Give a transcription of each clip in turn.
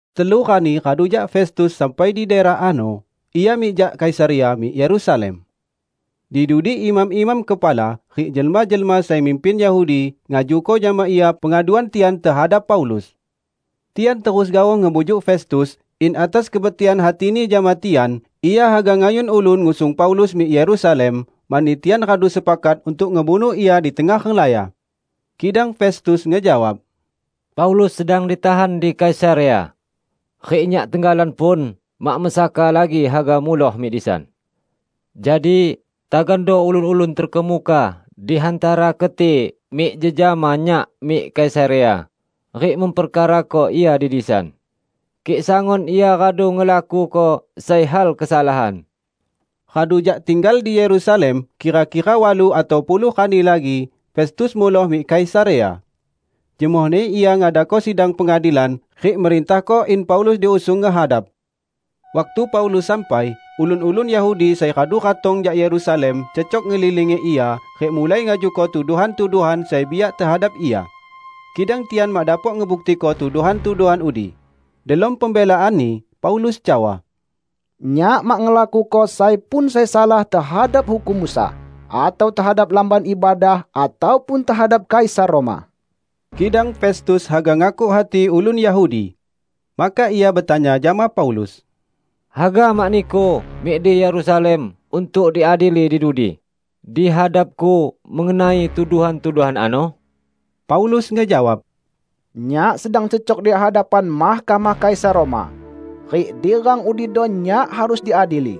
Telu rani radu jak Festus sampai di daerah ano, ia mik jak Kaisarea mik Yerusalem. Di dudi imam-imam kepala rik jelma-jelma sai mimpin Yahudi ngajuko jama ia pengaduan tian tehadap Paulus. Tian terus gaoh ngebujuk Festus in atas kebetikan hatini jama tian, ia haga ngayun ulun ngusung Paulus mik Yerusalem; mani tian radu sepakat untuk ngebunuh ia di tengah renglaya. Kidang Festus ngejawab, "Paulus sedang ditahan di Kaisarea; rik nyak tenggalan pun mak mesaka lagi haga muloh mik disan. Jadi, tagando ulun-ulun terkemuka di hantara keti mik jejama nyak mik Kaisarea rik memperkarako ia di disan, kik sangun ia radu ngelakuko sai hal kesalahan." Radu jak tinggal di Yerusalem kira-kira walu atau puluh rani lagi, Festus muloh mik Kaisarea. Jemohni ia ngadako sidang pengadilan rik merintahko in Paulus diusung ngehadap. Waktu Paulus sampai, ulun-ulun Yahudi sai radu ratong jak Yerusalem cecok ngelilingi ia, rik mulai ngajuko tuduhan-tuduhan sai biak tehadap ia. Kidang tian mak dapok ngebuktiko tuduhan-tuduhan udi. Delom pembelaanni, Paulus cawa, "Nyak mak ngelakuko sai pun sai salah tehadap hukum Musa atau tehadap Lamban Ibadah ataupun tehadap Kaisar Roma." Kidang Festus haga ngakuk hati ulun Yahudi. Maka ia betanya jama Paulus, "Haga mak niku mik di Yerusalem untuk diadili di dudi, di hadapku mengenai tuduhan-tuduhan ano?" Paulus ngejawab, "Nyak sedang cecok di hadapan Mahkamah Kaisar Roma; rik di rang udido nyak harus diadili.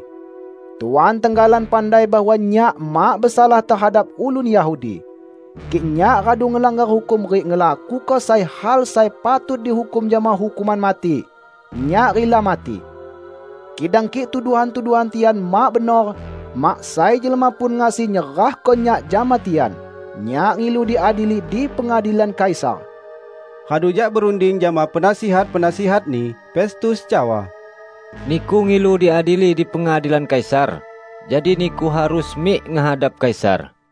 Tuan tenggalan pandai bahwa nyak mak besalah tehadap ulun Yahudi. Kik nyak radu ngelanggar hukum rik ngelakuko sai hal sai patut dihukum jama hukuman mati, nyak rila mati. Kidang kik tuduhan-tuduhan tian mak benor, mak sai jelma pun ngasi nyerahko nyak jama tian. Nyak ngilu diadili di pengadilan Kaisar!" Radu jak berunding jama penasihat-penasihatni, Festus cawa, "Niku ngilu diadili di pengadilan Kaisar, jadi niku harus mik ngehadap Kaisar."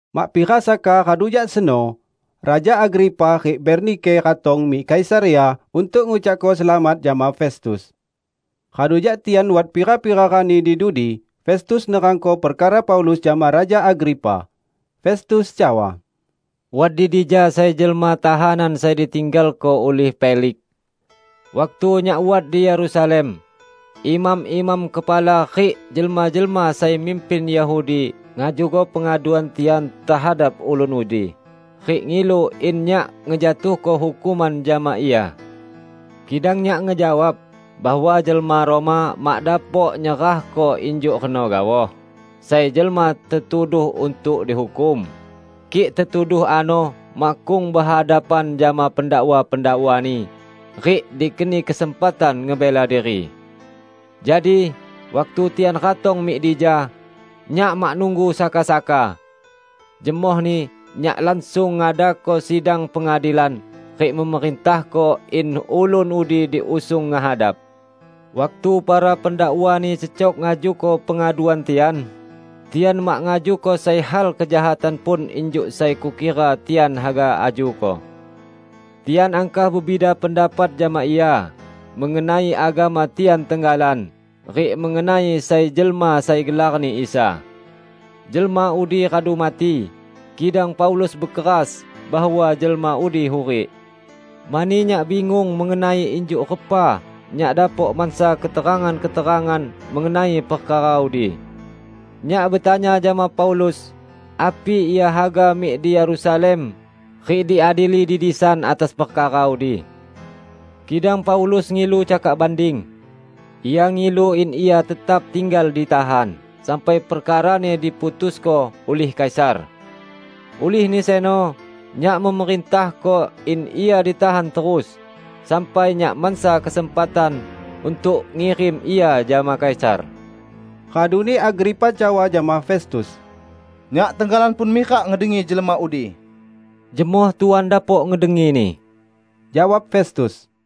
Mak pira saka radu jak seno, Raja Agripa rik Bernike ratong mik Kaisarea untuk ngucakko selamat jama Festus. Radu jak tian wat pira-pira rani di dudi, Festus nerangko perkara Paulus jama Raja Agripa. Festus cawa, "Wat di dija sai jelma tahanan sai ditinggalko ulih Feliks. Waktu nyak wat di Yerusalem, imam-imam kepala rik jelma-jelma sai mimpin Yahudi ngajuko pengaduan tian tehadap ulun udi rik ngilu in nyak ngejatuhko hukuman jama ia. Kidang nyak ngejawab bahwa jelma Roma mak dapok nyerahko injuk reno gaoh sai jelma tetuduh untuk dihukum, kik tetuduh ano makkung behadapan jama pendakwa-pendakwani rik dikeni kesempatan ngebela diri. Jadi, waktu tian ratong mik dija, nyak mak nunggu saka-saka. Jemohni nyak langsung ngadako sidang pengadilan rik memerintahko in ulun udi diusung ngehadap. Waktu para pendakwani cecok ngajuko pengaduan tian, tian mak ngajuko sai hal kejahatan pun injuk sai kukira tian haga ajuko. Tian angkah bebida pendapat jama ia mengenai agama tian tenggalan rik mengenai sai jelma sai gelarni Isa. Jelma udi radu mati, kidang Paulus bekeras bahwa jelma udi hurik. Mani nyak bingung mengenai injuk repa nyak dapok mansa keterangan-keterangan mengenai perkara udi, nyak betanya jama Paulus api ia haga mik di Yerusalem rik diadili di disan atas perkara udi. Kidang Paulus ngilu cakak banding; ia ngilu in ia tetap tinggal ditahan sampai perkarani diputusko ulih Kaisar. Ulihni seno nyak memerintahko in ia ditahan terus, sampai nyak mansa kesempatan untuk ngirim ia jama Kaisar." Raduni Agripa cawa jama Festus, "Nyak tenggalan pun mirak ngedengi jelma udi." "Jemoh Tuan dapok ngedengini," jawab Festus.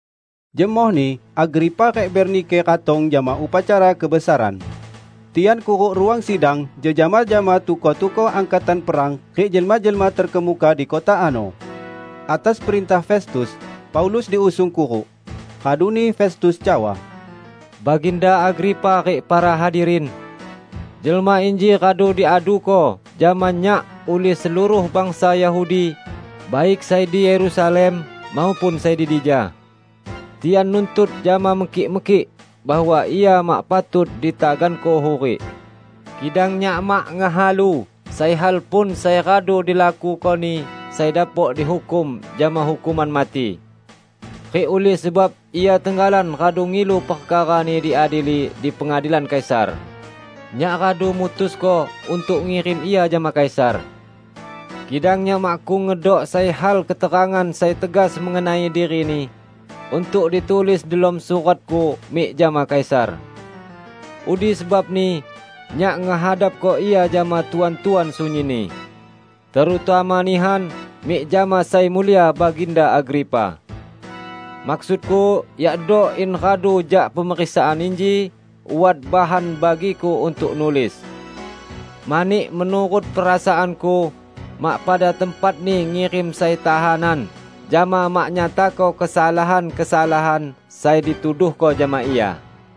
Jemohni Agripa rik Bernike ratong jama upacara kebesaran. Tian kuruk ruang sidang jejama jama tukoh-tukoh angkatan perang rik jelma-jelma terkemuka di kota ano. Atas perintah Festus, Paulus diusung kuruk. Raduni Festus cawa, "Baginda Agripa rik para hadirin! Jelma inji radu diaduko jama nyak ulih seluruh bangsa Yahudi, baik sai di Yerusalem maupun sai di dija. Tian nuntut jama mekik-mekik bahwa ia mak patut ditaganko hurik. Kidang nyak mak ngehalu sai hal pun sai radu dilakukoni sai dapok dihukum jama hukuman mati. Rik ulih sebab ia tenggalan radu ngilu perkarani diadili di pengadilan Kaisar, nyak radu mutusko untuk ngirim ia jama Kaisar. Kidang nyak makkung ngedok sai hal keterangan sai tegas mengenai dirini untuk ditulis delom suratku mik jama Kaisar. Udi sebabni nyak ngehadapko ia jama Tuan-tuan sunyinni, terutama nihan mik jama Sai Mulia Baginda Agripa! Maksudku yakdo in radu jak pemeriksaan inji, wat bahan bagiku untuk nulis. Mani menurut perasaanku, mak pada tempatni ngirim sai tahanan, jama mak nyatako kesalahan-kesalahan sai dituduhko jama ia."